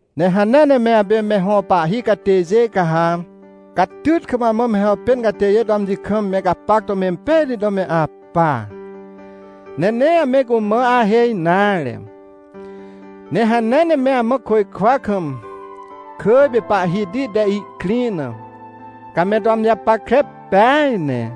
Ne hanea ne me apê me hõ pahhi catêjê, ca ha catyt kam amã me hàpên catêjê to amji kam me gapac to mempejti to me apa, ne nee ame cumã ahêj nare. Ne hanea ne me amã côjkwa kam, kỳj pê Pahhiti te ihkrĩ na, ca me to amji japackre peaj ne.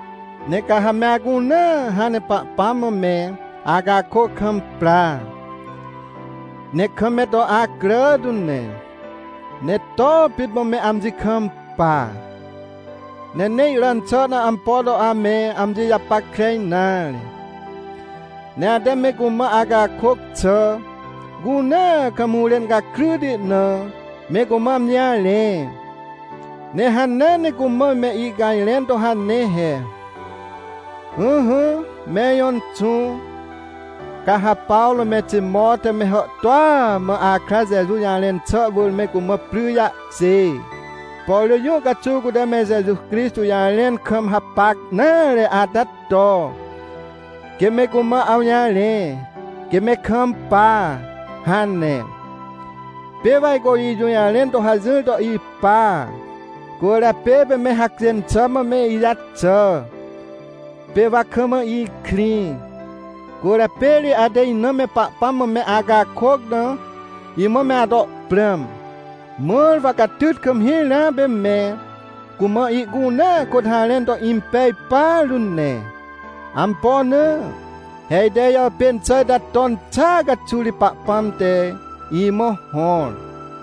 Ne ca ha me acunea hãn ne Pahpãm mã me acakôc kam pra, ne kam me to acrà tu ne. Ne to pit mã me amji kampa, ne nee iràn xà na ampo to ame amji japackre nare. Ne ate me cumã acakôc xà cunea kam hũrên gakryti na, me cumã amji jarẽ. Ne hanea ne cumã me icajrẽn to hane he: — Ỹhỹ me ijõ Inxũ, ca ha Pawrô me Timot te me hàhtôa mã akra Jeju jarẽn xà wỳr me cumã pry jahkjê. Por rỳ jũ caxuw cute me Jeju Crixtô jarẽn kam hapac nare ata to, quê me cumã awjarẽ, quê me kampa — hane. Pê wa ajco ijũjarẽn to hajỹr to ipa, cwỳrjapê pê me hacjên xà mã me ijaxà, pê wa kam ikrĩ. Cwỳrjapê ri ate ina me Pahpãm mã me acakôc na imã me ato prãm, mãr wa catyt kam hirãa pê me cumã ihcunea kôt harẽn to impej partu ne. Ampo na? He ite ijàpên xà ita ton xàa caxuw ri Pahpãm te imã hõr.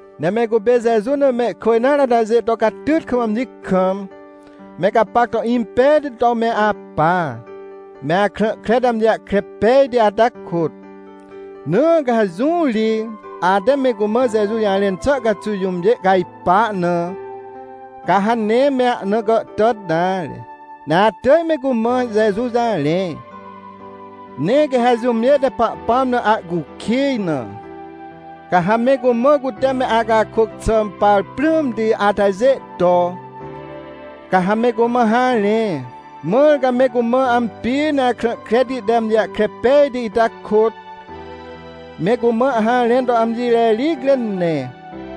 Ne me cupê Jeju na mehkwỳ nare atajê to catyt kam amji kam me gapac to impejti to me apa, me akrã kre te amji jahkre pejti ata kôt. Na ca ha jũ ri ate me cumã Jeju jarẽn xà caxuw jũmjê cajpar na, ca ha nee me ahna gàhtàt nare, ne atỳj me cumã Jeju jarẽ. Ne quê ha jũmjê te Pahpãm na acukij na, ca ha me cumã cute me acakôc xà par prãmti atajê to, ca ha me cumã harẽ. Mãr ca me cumã ampi ne akrã kreti te amji jahkre pejti ita kôt, me cumã harẽn to amji rericre ne.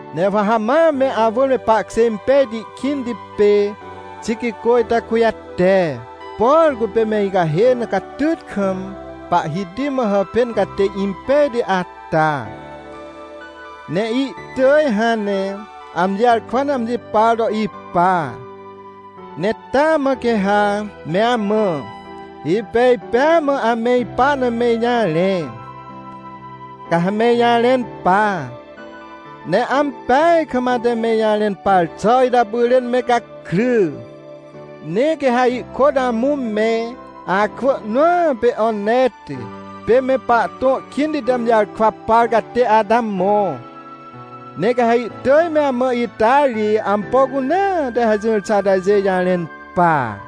Ne wa ha ma me awỳr me pahkjê impejti kĩnti pê Tiquicô ita kujate. Por cupê me icahê na catyt kam Pahhiti mã hàpên catê impejti ata, ne ihtỳj hãn ne amji jarkwa na amji par to ipa. Ne taa mã quê ha me amã, ipej pêa mã ame ipa na me ijarẽ. Ca ha me ijarẽn pa, ne ampeaj kam ate me ijarẽn par xà ita pyrên me gakry. Ne quê ha ihkôt amũ me akwỳ nõa pê Oneti, pê me pahtõ kĩnti te amji jarkwa par catê ata mõ. Ne quê ha ihtỳj me amã ita ri ampo cunea te hajỹr xà atajê jarẽn pa.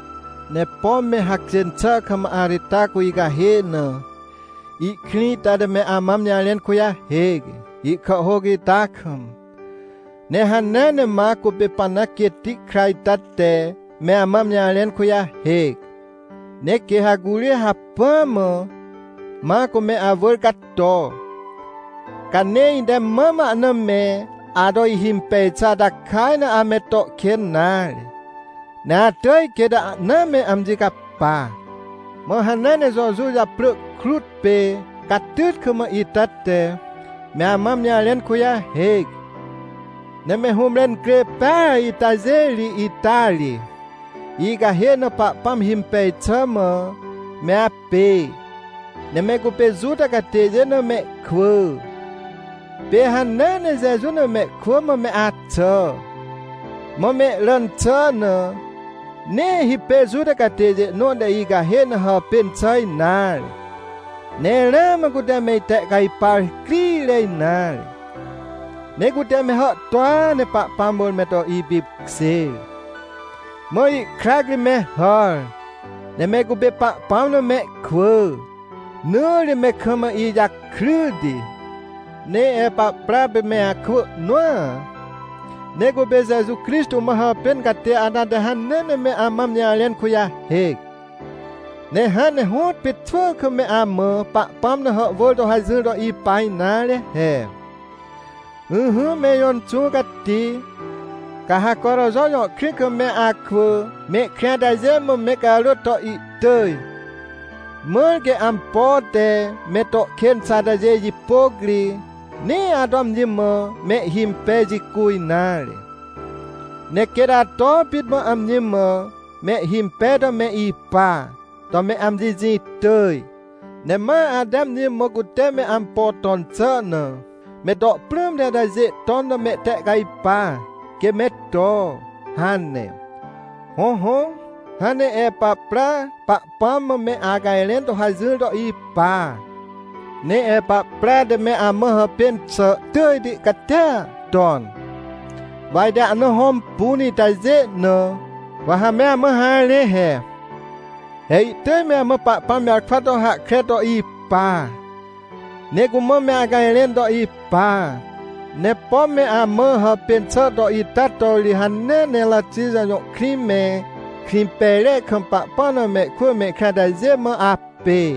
Ne pom me hacjên xà kam Aritarcô icahê na ihkrĩ ita te me amã amji jarẽn kujahêc, ihkàhhôc ita kam. Ne hanea ne Macô pê Parnap quêtti kra ita te me amã amji jarẽn kujahêc. Ne quê ha curi hacpỹ mã Macô me awỳr cato, ca nee ite mam ahna me ato ihimpej xà ata kaj na ame to kên nare, ne atỳj quêt ahna me amji capa. Mã hanea ne Jojuw japrỳ krut pê Catytkam ita te me amã amji jarẽn kujahêc. Ne me hũmre incrê peaj itajê ri ita ri icahê na Pahpãm himpej xà mã me apê. Ne me cupê Juta catêjê na mehkwỳ, pê hanea ne Jeju na mehkwỳ mã me axà. Mã mehràn xà na, nee hipêr Juta catêjê nõ te icahê na hàpên xà nare. Ne ramã cute me itehcajpar crire nare, ne cute me hàhtôa ne Pahpãm wỳr me to ipipkjêr, mã ihkrac ri me hàr, ne me cupê Pahpãm na mehkwỳ. Na ri me kam ijakryti. Ne Epapra pê me akwỳ nõa, ne cupê Jeju Crixtô mã hàpên catê ata te hanea ne me amã amji jarẽn kujahêc. Ne hãn ne hõtpê xwỳ kam me amã Pahpãm na hàhwỳr to hajỹr to ipa nare he: — Ỹhỹ, me ijõ Inxũ Cati, ca ha Coroxo jõ krĩ kam me akwỳ mehkrĩ atajê mã me carôt to ihtỳj, mãr quê ampo te me to kên xà ata jipôc ri, nee ato amji mã mehhimpej jicu nare. Ne quêt ato pit mã amji mã mehhimpej to me ipa to me amji jĩ tỳj. Ne ma ate amji mã cute me ampo ton xà na me to prãmti atajê ton na mehtehcajpa quê me to — hane. Hõhõ, hãn ne Epapra Pahpãm mã me acajrẽn to hajỹr to ipa. Ne Epapra te me amã hàpên xà tỳjti catia ton, wa ite ahna hõmpun itajê na, wa ha me amã harẽ he. He ihtỳj me amã Pahpãm jarkwa to hahkre to ipa, ne cumã me acajrẽn to ipa. Ne pom me amã hàpên xà to ita to ri hanea ne Ratixa jõ krĩ me Krĩmpejre kam Pahpãm na mehkwỳ mehkrĩ atajê mã apê.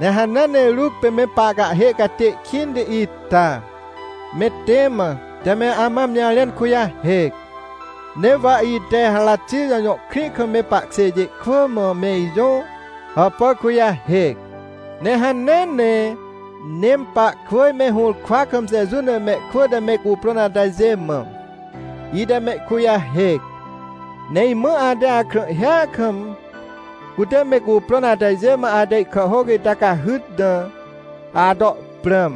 Ne hanea ne Ruc pê me pahcahhê catê kĩnti ita me Tema te me amã amji jarẽn kujahêc. Ne wa ite Ratixa jõ krĩ kam me pahkjêjê kwỳ mã me ijõ hàpà kujahêc. Ne hanea ne Nempakwỳj me hũrkwa kam Jeju na mehkwỳ te me cuprõn atajê mã, ite mehkujahêc. Ne imã ate akrãhhia kam, cute me cuprõn atajê mã ate ihkàhhôc ita cahyt na, ato prãm.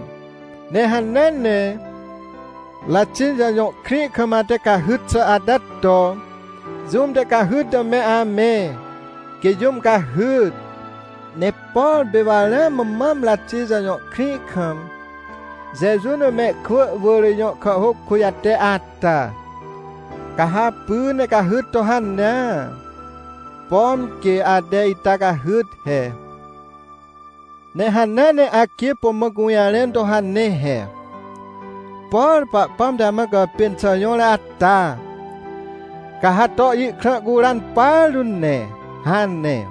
Ne hanea ne Ratixa jõ krĩ kam ate cahyt xà ata to jũm te cahyt na me amẽ, quê jũm cahyt. Ne por pê wa ramã mam Ratixa jõ krĩ kam Jeju na mehkwỳ wỳr ijõ kàhhôc kujate ata, ca ha apy ne cahyt to hanea, pom quê ate ita cahyt he. Ne hanea ne Arquipo mã gũjarẽn to hane he: — Por Pahpãm te amã gàpên xà jõr ata, ca ha to ihkrã curan partu ne — hane.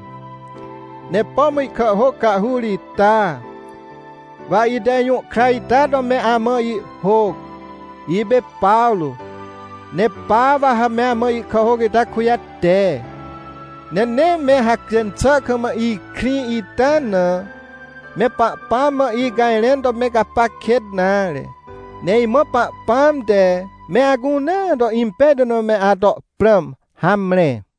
Ne pom ihkàhhôc cahhur ita, wa ite ijũhkra ita to me amã ihhôc. Ipê Pawrô, ne pa wa ha me amã ihkàhhôc ita kujate. Ne nee me hacjên xà kam ikrĩ ita na, me Pahpãm mã icajrẽn to me gapac kêt nare. Ne imã Pahpãm te me acunea to impejti na me ato prãm. Hamre.